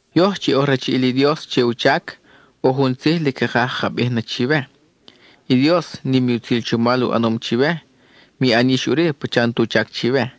Yoj chi oj rachiʼil i Dios che u chac, ʼo jun tzij lic cakaj caka bij na chiwe: i Dios, nim i utzil chomal u ʼanom chiwe; mi ʼan yix ʼuri pacha n-tu chac chiwe.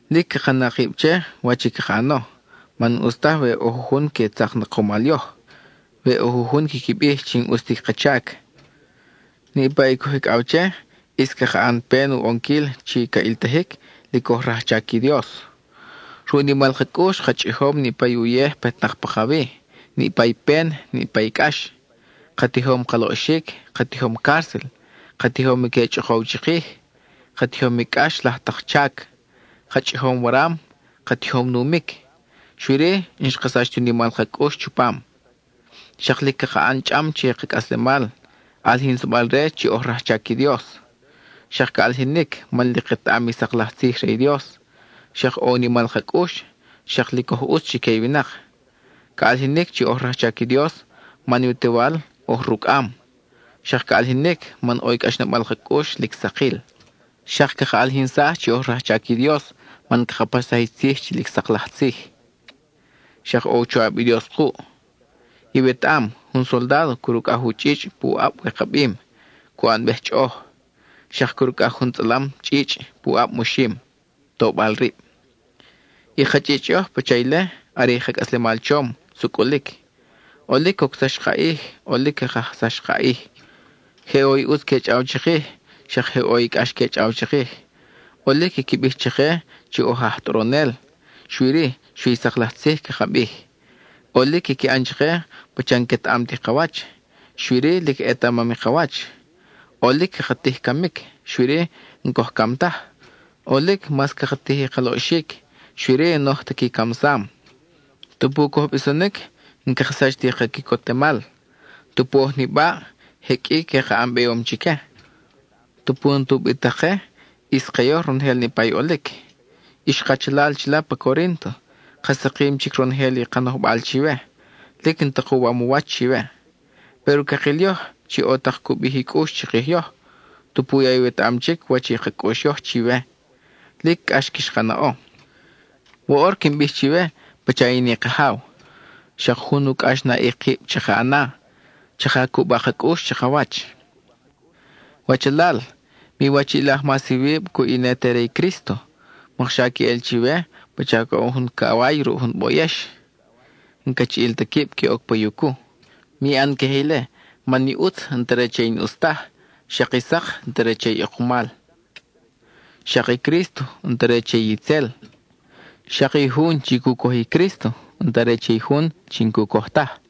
Lic caka na kib che, wach i caka ʼano man n-ʼus taj we ʼo jujun que tzak na kumal yoj, we ʼo jujun quiqui bij chi n-ʼus ti ka chac. Niʼpa i coj icʼaw che ʼis caka ʼan pen u ʼonquil chi ca ʼiltajic lic oj rajchac i Dios. Ruʼ u nimal ka cʼux ka chʼijom niʼpa i uyej petnak pakawi, niʼpa i pen, niʼpa i cʼax. Ka tijom ka loʼxic, ka tijom cárcel; ka tijom i que chʼokow chikij; ka tijom i cʼax laj tak chac; ka chʼijom waram; ka tijom numic; xui-ri, n-xka sach ti u nimal ka cʼux chupam. Xak lic caka ʼan chʼam che i ka cʼaslemal, ʼalijinsabal-re chi oj rajchac i Dios. Xak ca ʼalijinic, man lic ketaʼam i sak laj tzij re i Dios, xak ʼo u nimal ka cʼux, xak lic oj ʼutz chique i winak. Ca ʼalijinic chi oj rajchac i Dios man i u Tewal oj rucʼam; xak ca ʼalijinic man ʼo i cʼaxnabal ka cʼux lic sakil. Xak caka ʼalijinsaj chi oj rajchac i Dios man caka paxsaj i tzij chi sak laj tzij; xak ʼo u choʼab i Dios kuʼ. Iwetaʼam, jun soldádo crucʼaj u chʼichʼ pu ʼab wikabim, cu ʼanbej chʼoʼoj; xak crucʼaj jun tzʼalam chʼichʼ pu ʼab moxim, tobal rib. I ka chʼichʼ yoj pacha ile, are i ka cʼaslemal chom, sucʼulic. ʼOlic cocsax i ka ʼij; ʼolic xa ca kajsax i ka ʼij. Je ʼo i ʼutz que chʼaw chikij, xak je ʼo i cʼax que chʼaw chikij. ʼOlic quiqui bij chake chi oj aj tʼoronel, xui-ri xui i sak laj tzij caka bij. ʼOlic quiqui ʼan chake pacha n-quetaʼam ti ka wach, xui-ri, lic ʼetamam i ka wach. ʼOlic caka tij i camic, xui-ri, n-coj cam taj. ʼOlic mas caka tij i ka loʼxic, xui-ri n-oj ta qui camsam. Tupu coj bisonic, n-caka sach ti ka quicotemal. Tupu oj nibaʼ, je qʼui que ka ʼan beyom chique. Tupu n-ta ubitak ke, ʼis ke yoj ronojel niʼpa i ʼolic. Ix kachalal chila pa Corínto, ka sakim chic ronojel i ka nojbal chiwe; lic n-ta kuwam u wach chiwe. Péro cakil yoj chi ʼo tak cu bij i cʼux chikij yoj, tupu ya iwetaʼam chic wach i ka cʼux yoj chiwe, chi lic cʼax quix ka naʼo. Woʼor quin bij chiwe, pacha in i kajaw: xak jun u cʼaxnaʼic kib chaka na; chaka cuba ka cʼux chakawach. Wachalal, miwachiʼilaj mas iwib cuʼ i ne te re i Crísto; mokxa queʼel chiwe pacha coʼon jun caway ruʼ jun boyex, n-cachiʼil ta quib que oc pa yucu. Mi ʼan queje ile, man i ʼutz n-ta re che i n-ʼus taj; xak i sak n-ta re che i ʼekumal. Xak i Crísto, n-ta re che itzel; xak i jun chi cu coj i Crísto, n-ta re che i jun chi n-cu coj taj.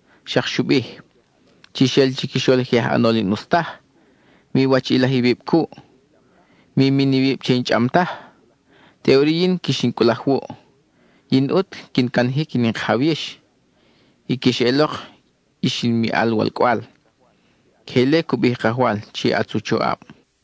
Xak xu bij: Chix ʼel chiquixol i je aj ʼanol i n-ʼus taj; miwachiʼilaj iwib cuʼ. Mi min iwib che i n-chʼam taj. Teʼuri yin quix in cʼulaj wuʼ. Yin ʼut quin canajic in i Kajaw yix, y quix eʼelok, ix in miʼal walcʼwal. Queje ile cu bij i Kajwal chi ʼatz u choʼab.